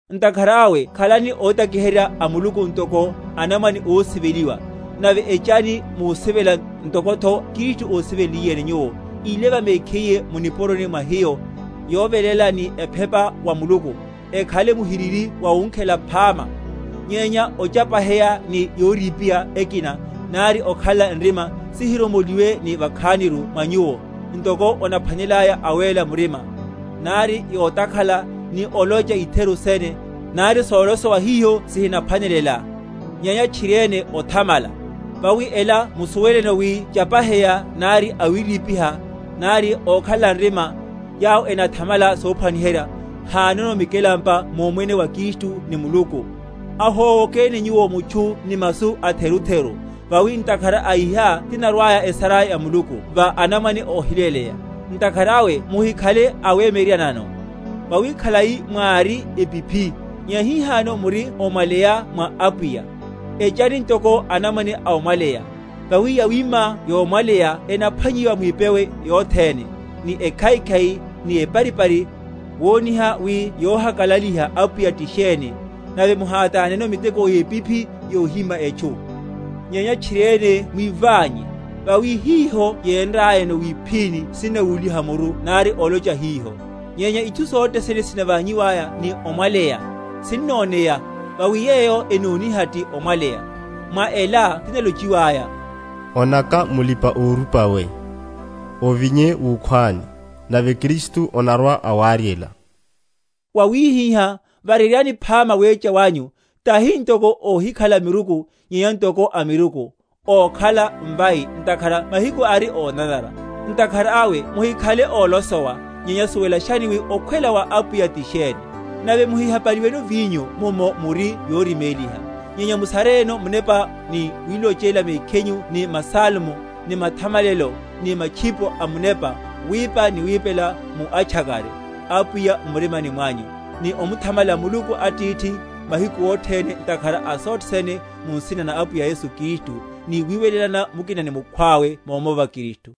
Ntakhara awe khalani ótakiherya a Muluku, ntoko anamwane ósiveliwa; nave echani musivela ntokotho Kristu ósivenliyeni nyuwo, íleva mekhiye mu nipuroni mwa hiyo, yoveléla ni ephepa wa Muluku, ekhale muhiriri wawunkhela phama. Nyenya ochapaheya ni yorípiha ekina, nari okhalela nrima, sihiromoliwe ni vakhan’ru mwa nyuwo, ntoko onaphwanelelaya awéla murima; nari yotakhala, ni olocha itheru sene, nari solosowa hiho sihinaphwanelela; nyenya tchiriene othamala. Vawi ela musuweleno wi chapaheya, nari awírípiha, nari okhalela nrima, yawo enathamala sophwaniherya, hanono mikelampa mumwene wa Kristu ni Muluku. Ahówokeni nyuwo mutchu ni masu atherutheru, vawi ntakhara a iha tinarwaya esara ya Muluku va anamwane óhiléleya. Ntakhara awe muhikhale awemyeryeryanano; vawi khalai mwári epiphi, nyenya hihano muri omwaleya mwa Apwiya; echani ntoko anamwane a omwaleya, vawi yawima yomwaleya enaphwanyiwa mwipewe yothene, ni ekhaikhai, ni eparipari, woniha wi yohakalaliha Apwiya ti sheni; nave muhátáneno miteko yepiphi yohíma etchu, nyenya tchiriene mwíványe; vawi hiho yénrayano wiphíni sinnawúliha muru nari olocha hiho. Nyenya itchu sothene sinavanyiwaya ni omwaleya, sinnoneya; vawi yeyo enoniha ti omwaleya. Mwa ela tinalochiwaya, onaka mulipa‐orupa we, ovinye wukhwani, nave Kristu onarwa‐awaryela. Vawihihá, varyeryani phama wecha wanyu, tahi ntoko óhikhala miruku, nyenya ntoko amiruku; ókhala mvai, ntakhara mahiku ari ónanara. Ntakhara awe muhikhale ólosowa, nyenya suwelashani wi okhwela wa Apwiya ti sheni. Nave muhihapaliweno vinyo, mummo muri yoriméliha; nyenya musareyeno Munepa, ni wilochela mekhinyu ni masalmo, ni mathamalelo, ni matchipo amunepa, wipa ni wipela mu atchakare Apwiya m’murimani mwanyu; ni omuthamala Muluku Atithi mahiku othene, ntakhara a sothe sene, mu nsina na Apwiyahu Yesu Kristu; ni wiwelelana mukina ni mukhwawe mómova Kristu.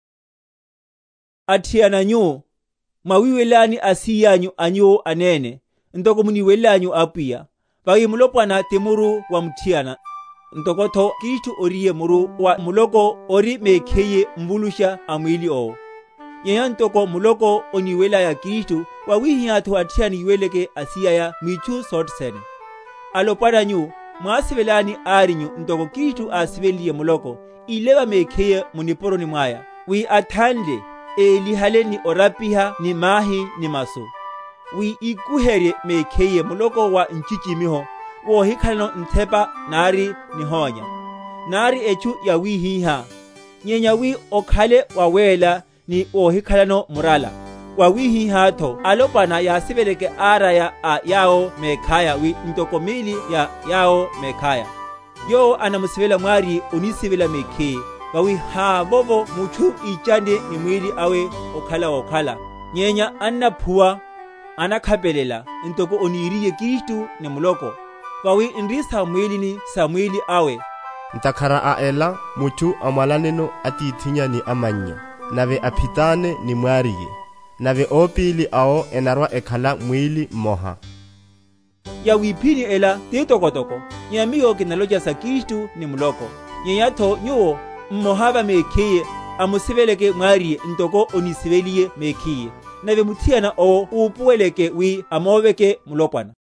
Sophwanelela mwimusi ya mutchu. Athiana nyu, mwawiweleláni asíyanyu a nyuwo anene, ntoko muniwelelanyu Apwiya. Vawi mulopwana ti muru wa muthiana, ntokotho Kristu oríye muru wa muloko, ori mekhiyeru Mvulusha a mwíli owo. Nyenya ntoko muloko oniwelelaya Kristu, wawihihátho athiana yiweleleke asíyaya mwitchu sothene. Alopwana nyu, mwásiveláni árinyu, ntoko Kristu ásivenliye muloko, ívelela mekhiye mu nipuroni mwaya; wi athanle, élihale ni orapiha ni mahi ni masu; wi íkuherye mehkiye muloko wa nchichimiho, wohikhalano nthepa, nari nihónya, nari etchu yawihiha; nyenya wi okhale wawéla, ni wohikhalano murala. Wawihihátho alopwana yasiveleke áraya a yawo mekhaya wi ntoko míli ya yawo mekhaya. Yowo onamusivela mwáriye onisivela mekhiye; Vawi havovo mutchu íchanne ni mwíli awe okhala wokhala; nyenya annaphuwa, anakhapelela, ntoko oniriye Kristu ni muloko; vawi n’ri sam’mwílini sa mwíli awe. Ntakhara a ela mutchu amwalaneno atithinnya ni amannya, nave aphitane ni mwáriye; nave opíli awo enarwa‐ekhala mwíli mmoha. Yawiphíni ela titokotoko; nyenya miyo kinalocha sa Kristu ni muloko. Nyenyatho nyuwo, mmoha va mekhiye, amusiveleke mwáriye, ntoko onísiveleliye mekhiye; nave muthiana owo upuweleke wi amoveke mulopwana.